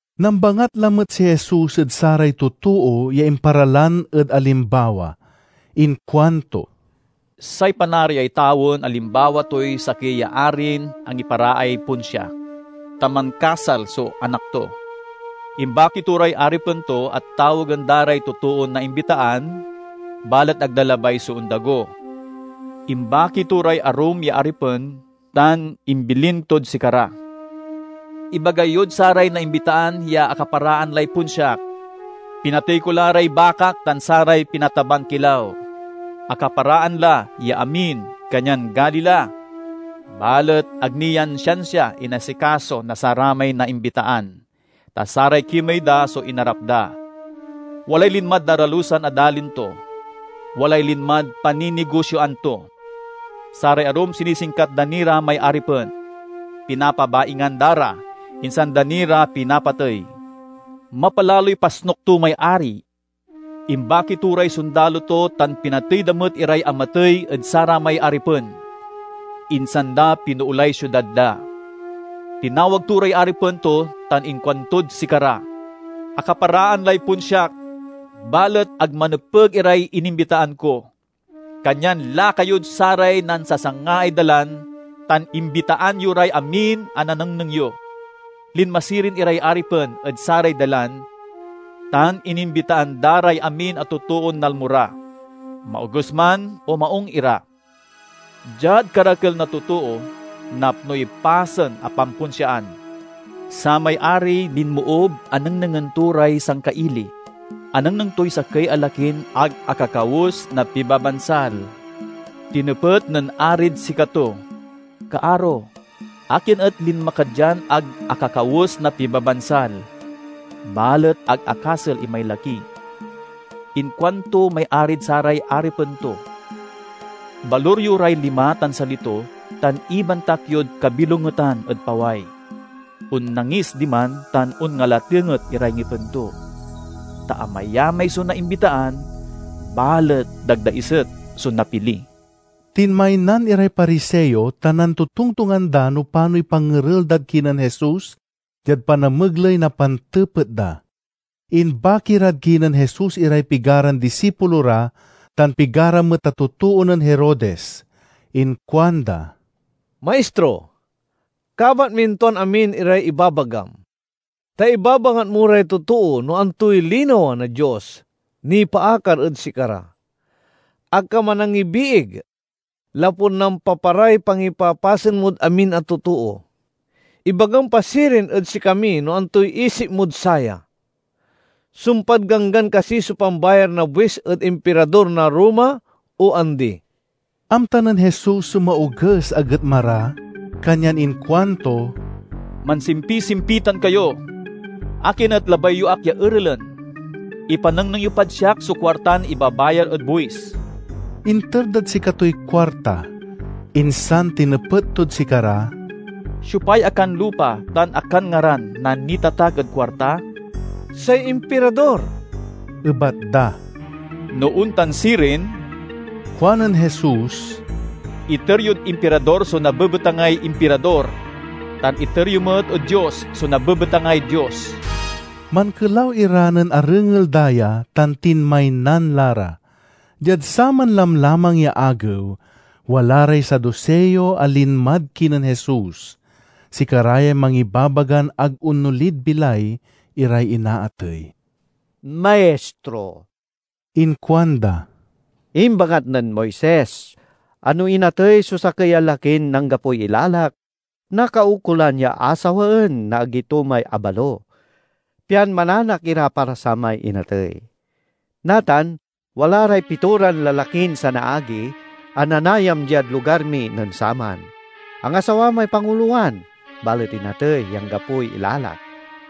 Nambangat lamet si Jesus ed saray totoo ya imparalan ed alimbawa. Inkuanto, "Say Panariay tawen alimbawa toy sakey ya arin angiparaay ponsia, ta mankasal so anak to. Imbaki to ray aripen to a tawagen da ray totoon naimbitaan, balet ag da labay so ondago. Imbaki to ray arum ya aripen tan imbilin tod sikara: 'Ibaga yod saray naimbitaan ya akaparaan lay ponsiak, pinatey ko la ray bakak tan saray pinataban kilaw. Akaparaan la ya amin, kanyan gali la!' Balet ag ni yan siansia inasikaso na saramay naimbitaan, ta saray kimey da so inarap da. Walay linmad daralusan a dalin to, walay linmad panninigosioan to. Saray arum sinisingkat da ni ra may aripen, pinapabaingan da ra, insan da ni ra pinapatey. Mapalaloy pasnuk to may ari. Imbaki to ray sondalo to tan pinatey da met iray amatey ed saramay aripen, insan da pinoolay siudad da. Tinawag to ray aripen to tan inkuantod sikara, 'Akaparaan lay ponsiak, balet ag manepeg iray inimbitaan ko. Kanyan lakayod saray nansasangaay dalan tan imbitaan yo ray amin a nanengneng yo.' Linma sirin iray aripen ed saray dalan tan inimbitaan da ray amin a totoon nalmo ra, maoges man o maung ira. Diad karakel na totoo, napnoy pasen a pamponsiaan. "Samay ari linmoob a nengnengen to ray sangkaili. Anengneng toy sakey a lakin ag akakawes na pibabansal. Tinepet nen arid sikato, 'Kaaro, akin et linma ka dian ag akakawes na pibabansal?' Balet ag akasel imay laki. Inkuanto may arid saray aripen to, 'Balur yo ray lima tan sali to tan ibantak yod kabilongetan ed paway. Onnangis diman tan onngalatenget iray ngipen to.' "Ta amayamay so naimbitaan, balet dagdaiset so napili." Tinmaynan iray Pariseo tan nantotongtongan da no panoy pangerel dad kinen Jesus, diad panamegley na pantepet da. Imbaki rad kinen Jesus iray pigaran disipulo ra tan pigara met a totoo nen Herodes. Inkuanda, "Maistro, kabat min tuan amin iray ibabagam, ta ibabangat mo ray totoo no antoy linawa na Dios nipaakar ed sikara. Ag ka manangibiig, lapud nampaparay pangipapasen mod amin a totoo. Ibagam pa sirin ed sikami no antoy isip mod saya? Sumpad Ganggan kasi so pambayar na buis ed Impirador na Roma o andi?" Amta nen Jesus so maoges a getma ra kanyan inkuanto, "Mansimpisimpitan kayo! Akin et labay yo ak ya erelen? Ipanengneng yo pad siak so kuartan ibabayar ed buis!" Inter dad sikatoy kuarta, insan tinepet tod sikara, Siopay akanlupa tan akanngaran na nitatak ed kuarta?" "Say Impirador," ebat da. "No ontan sirin," kuanen Jesus, "iter yod Impirador so nabebetangay Impirador, tan iter yo met ed Dios so nabebetangay Dios." Mankelaw ira nen arengel da ya, tan tinmaynan la ra. Diad saman lamlamang ya agew, wala ray Saduseo a linmad kinen Jesus. (Sikara yay mangibabagan ag onolid bilay iray inaatey.) "Maistro," inkuanda, "imbangat nen Moises a no inatey so sakey a lakin anggapoy ilalak, nakaukolan ya asawaen na agi to may abalo, pian mananak ira para samay inatey. Natan, wala ray pitoran lalakin sanaagi a nanayam diad lugar mi nen saman. Angasawa may pangulowan, balet inatey ya anggapoy ilalak.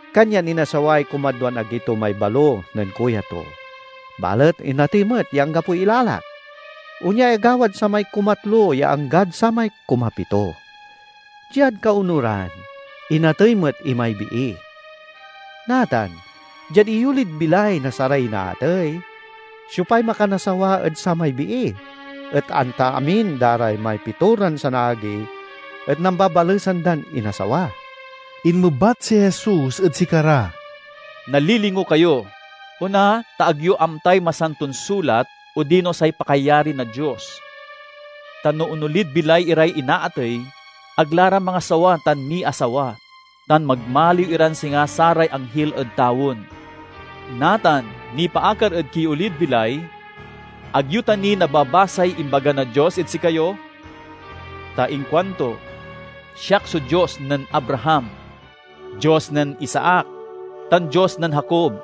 Kanyan inasaway kumadwan agi to may balo nen kuya to. Balet inatey met ya anggapoy ilalak. Onyay agawad samay kumatlo ya anggad samay kumapito. Diad kaonuran, inatey met imay bii. Natan, diad iyolid bilay na saray inaatey, siopay makanasawa ed samay bii, et anta amin da ra may pitoran sanaagi et nambabalesan dan inasawa?" Inmebat si Jesus ed sikara, "Nalilingo kayo! On, a, ta ag yo amtay Masanton Sulat odino say pakayari na Dios. Ta no onolid bilay iray inaatey, ag la ra mangasawa tan miasawa, tan magmaliw iran singa saray anghil ed tawen. Natan, nipaakar ed kiolid bilay: ag yo ta ni nababasay imbaga na Dios ed sikayo? Ta inkuanto, 'Siak so Dios nen Abraham, Dios nen Isaac, tan Dios nen Jacob.'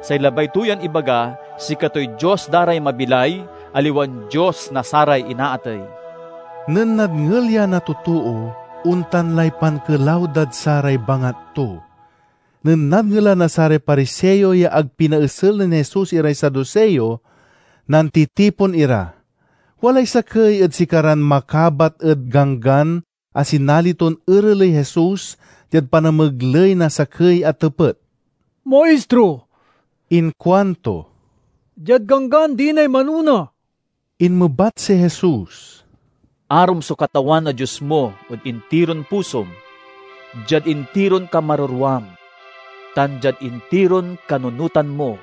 Say labay to yan ibaga sikatoy Dios da ray mabilay, aliwan Dios na saray inaatey." Nen nadngel ya na totoo, ontan lay pankelaw dad saray bangat to. Nen nadngelan na saray Pariseo ya ag pinaesel nen Jesus iray Saduseo, nantitipon ira. Walay sakey ed sikaran makabat ed Ganggan a sinali ton ereley Jesus diad panamegley na sakey a tepet. "Maistro," inkuanto, "diad Ganggan dinay manona?" Inmebat si Jesus, " 'Arom so Katawan a Dios mo ed intiron pusom, diad intiron kamarerwam, tan diad intiron kanunotan mo.'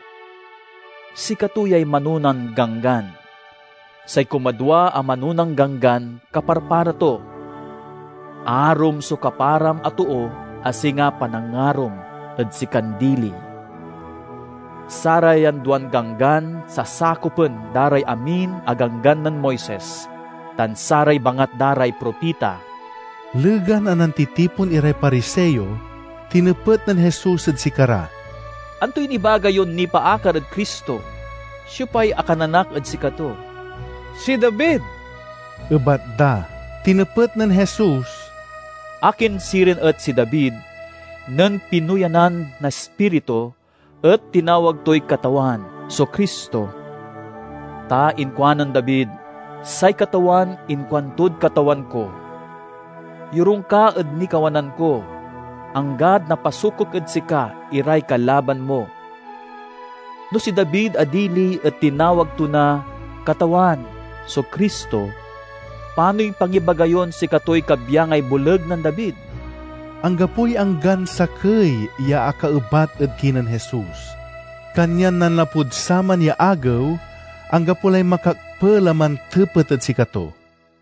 Sikato yay manonan ganggan. Say kumadwa a manonan ganggan kaparpara to: 'Arom so kaparam a too a singa panangarom ed sikan dili.' Sarayan duan ganggan sasakopen da ray amin a Ganggan nen Moises tan saray bangat da ray propita." Legan a nantitipon iray Pariseo, tinepet nen Jesus ed sikara, "Antoy nibaga yon nipaakar ed Cristo? Siopay akananak ed sikato?" "Si David," ebat da. Tinepet nen Jesus, "Akin sirin et si David, nen pinuyanan na Ispiritu, et tinawag toy 'Katawan' so Cristo? Ta inkuanen David, 'Say Katawan inkuantod Katawan ko: Yorung ka ed nikawanan ko, anggad napasukok ed sika iray kalaban mo.' No si David a dili et tinawag to na 'Katawan' so Cristo, panoy pangibaga yon sikatoy kabyangay boleg nen David?" Anggapoy anggan sakey ya akaebat ed kinen Jesus. Kanyan nanlapud saman ya agew, anggapo lay makakpel a mantepet ed sikato.